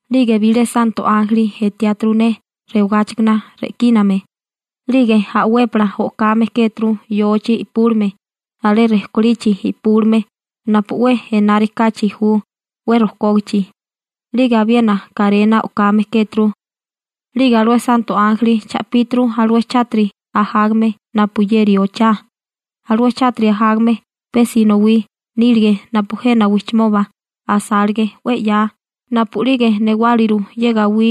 'Lige bilé santo ánjeli etiáturu ne rewigáchikana re'kíname, 'lige a'wépala o'kame kéturu yochi i'púlime alé rejkolichi i'púlime napu 'we enárikáchi ju 'we rojkógichi, 'lige abiena karena o'kame kéturu. 'Lige alué santo ánjeli cha'píturu alué chátiri ajágame napuyeri ochá, alué chátiri ajágame pe sinowí nílige napu jena wijchimoba asálige 'we 'ya napu'lige newáliru ye gawí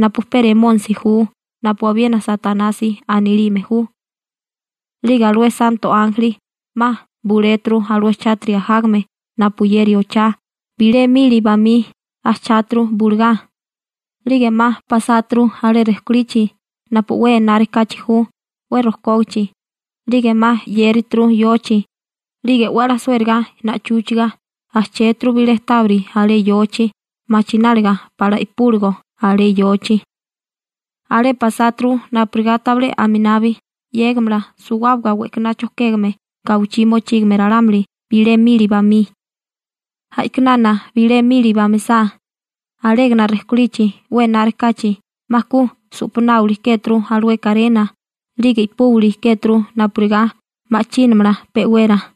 napu pe Remónisi ju napu abiena Satanasi anilime ju. 'Lige alué santo ánjeli 'ma buléturu alué chátiri ajágame napuyeri ochá bilé mili bamí ajcháturu bulugá, 'lige 'ma pasáturu alé rejkolichi napu 'we enárikáchi ju 'we rojkógichi, 'lige 'ma 'yérituru yochi, 'lige 'we 'la suériga na'chúchiga ujchéturu bilé tábiri alé yochi machináliga pala i'púligo alé yochi. Alé pasáturu napurigá tabilé aminabi 'yégamala suwábaga we'kaná chojkégame gawichí mochígame ralámuli bilé mili bamí. A'kinana bilé mili bamisá alégana rejkolichi 'we enárikáchi 'ma ku su'panáwili kéturu alué karena 'lige i'púwili kéturu napurigá ma'chínamala pe'wera.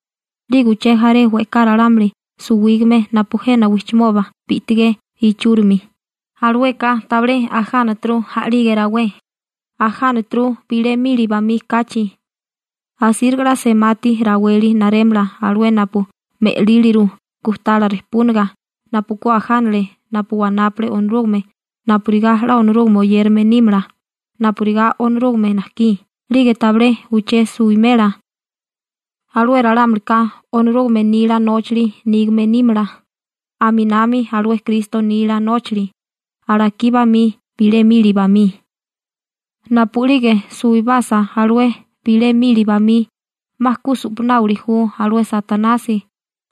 'Lige uché jaré we'ká ralámuli suwígame napu jena wijchimoba bi'tigé ichúrimi, alueka tabilé ajánaturu a'lige rawé, ajánaturu bilé mili bamí kachi. Asíriga 'la semati raweli narémala alué napu me'líliru gujtala rejpúniga napu ku ajánale napu wanápale Onorúgame napurigá 'la Onorúgame oyérame nímala napurigá Onorúgame najkí 'lige tabilé uché suwimela. Alué ralámulika Onorúgame nila nóchali nígame nímala, aminami alué Kristo nila nóchali, alakí bamí, bilé mili bamí. Napu'lige suwibasa alué bilé mili bamí, 'ma ku su'panáwili ju alué Satanasi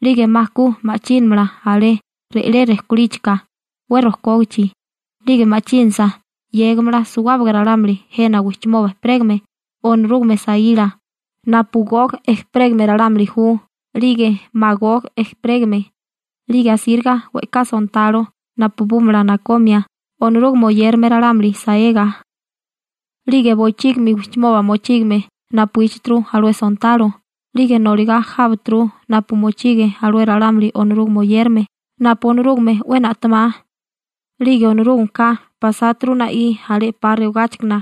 'lige 'ma ku ma'chínamala alé re'lé rejkolíchika 'we rojkógichi, 'lige ma'chínasa 'yégimala suwábaga ralámuli jena wijchimoba ejperégame Onorúgame saíla napu Gog ejperégame ralámuli ju 'lige Magog ejperégame, 'lige asíriga we'ká sontalo napabúmala nakomia Onorúgame oyérame ralámuli saega. 'Lige bochígimi wijchimoba mochígame napuíchituru alué sontalo, 'lige noligá jábaturu napu mochige alué ralámuli Onorúgame oyérame napu Onorúgame 'we na'temá. 'Lige Onorúgameka pasáturu na'í alé 'pa rewagáchikana,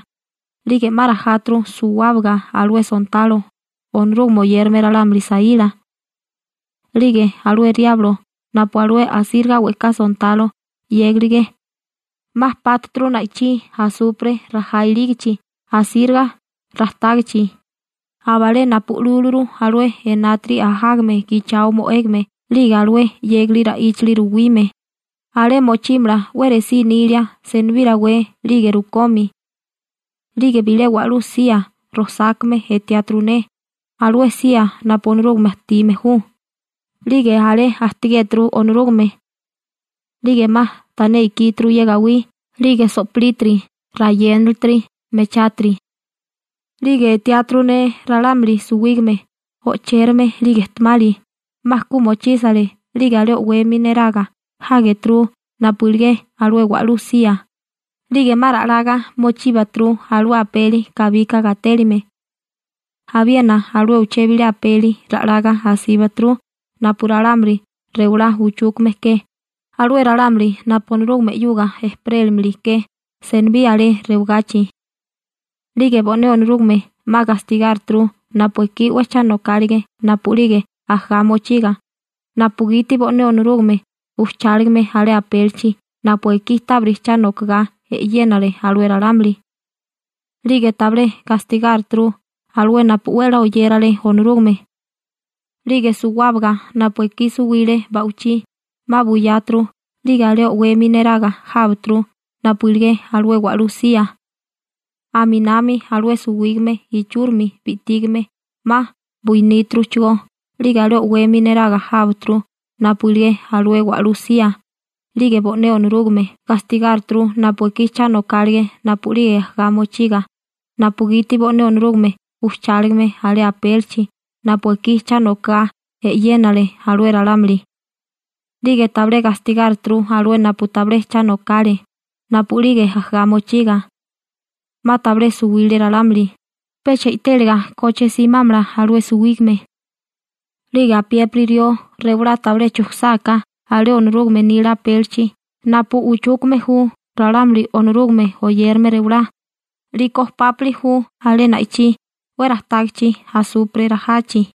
'lige 'ma rajáturu suwábaga alué sontalo, Onorúgame oyérame ralámuli saíla. 'Lige alué Riablo napu alué asíriga we'ká sontalo 'yégilige, 'ma pátuturu na'ichí asupre rajá ilígachi asíriga rajtágichi, abalé napu lúluru alué enátiri ajágame gichao mo'égame 'lige alué 'yégali ra'íchali ruwime. Alé mochímala 'we resí nilia senibí rawé 'lige rukomi. 'Lige bilé wa'lú sía rojsákame etiáturu ne, alué sía napu Onorúgame ajtime ju, 'lige alé ajtigéturu Onorúgame. 'Lige 'ma tané ikíturu ye gawí, 'lige so'pilítiri, rayénalitiri, mechátiri. 'Lige etiáturu ne ralámuli suwígame, o'chérame 'lige ejtemali, 'ma ku mochísale 'lige alé o'wemi neraga jágeturu napu iligé alué wa'lú sía, 'lige 'ma ra'laga mochíbaturu alué apeli kabika gatélime. Abiena alué uché bilé apeli ra'laga asíbaturu napu ralámuli rewalá uchúkame ke, alué ralámuli napu Onorúgame 'yuga ejperélimili ke senibí alé rewagachi. 'Lige bo'né Onorúgame 'ma gastigárituru napu ekí 'we cha nokálige napu'lige ajagá mochiga, napugiti bo'né Onorúgame ujcháligame alé apélichi napu ekí tábiri cha nokagá e'yénale alué ralámuli. 'Lige tabilé gastigáruturu alué napu 'we 'la oyérale Onorúgame. 'Lige suwábaga napu ekí suwile ba'wichí 'ma buyáturu 'lige alé o'wemi neraga jábaturu napu iligé alué wa'lú sía. Aminami alué suwígame ichúrimi bi'tígame 'ma buiníturuchigó 'lige alé o'wemi neraga jábaturu napu iligé alué wa'lú sía, 'lige bo'né Onorúgame gastigárituru napu ekí cha nokálige napu'lige ajagá mochiga, napugiti bo'né Onorúgame ujcháligame alé apélichi napu ekí cha nokagá e'yénale alué ralámuli. 'Lige tabilé gastigárituru alué napu tabilé cha nokale napu'lige ajagá mochiga. 'Ma tabilé suwile ralámuli, pecha i'téliga koche simámala alué suwígame. 'Lige apiépiri rió rewalá tabilé chujkusáká alé Onorúgame nila apélichi napu uchúkame ju ralámuli Onorúgame oyérame rewalá, 'liko pápili ju alé na'ichí 'we rajtágichi asupre rajachi.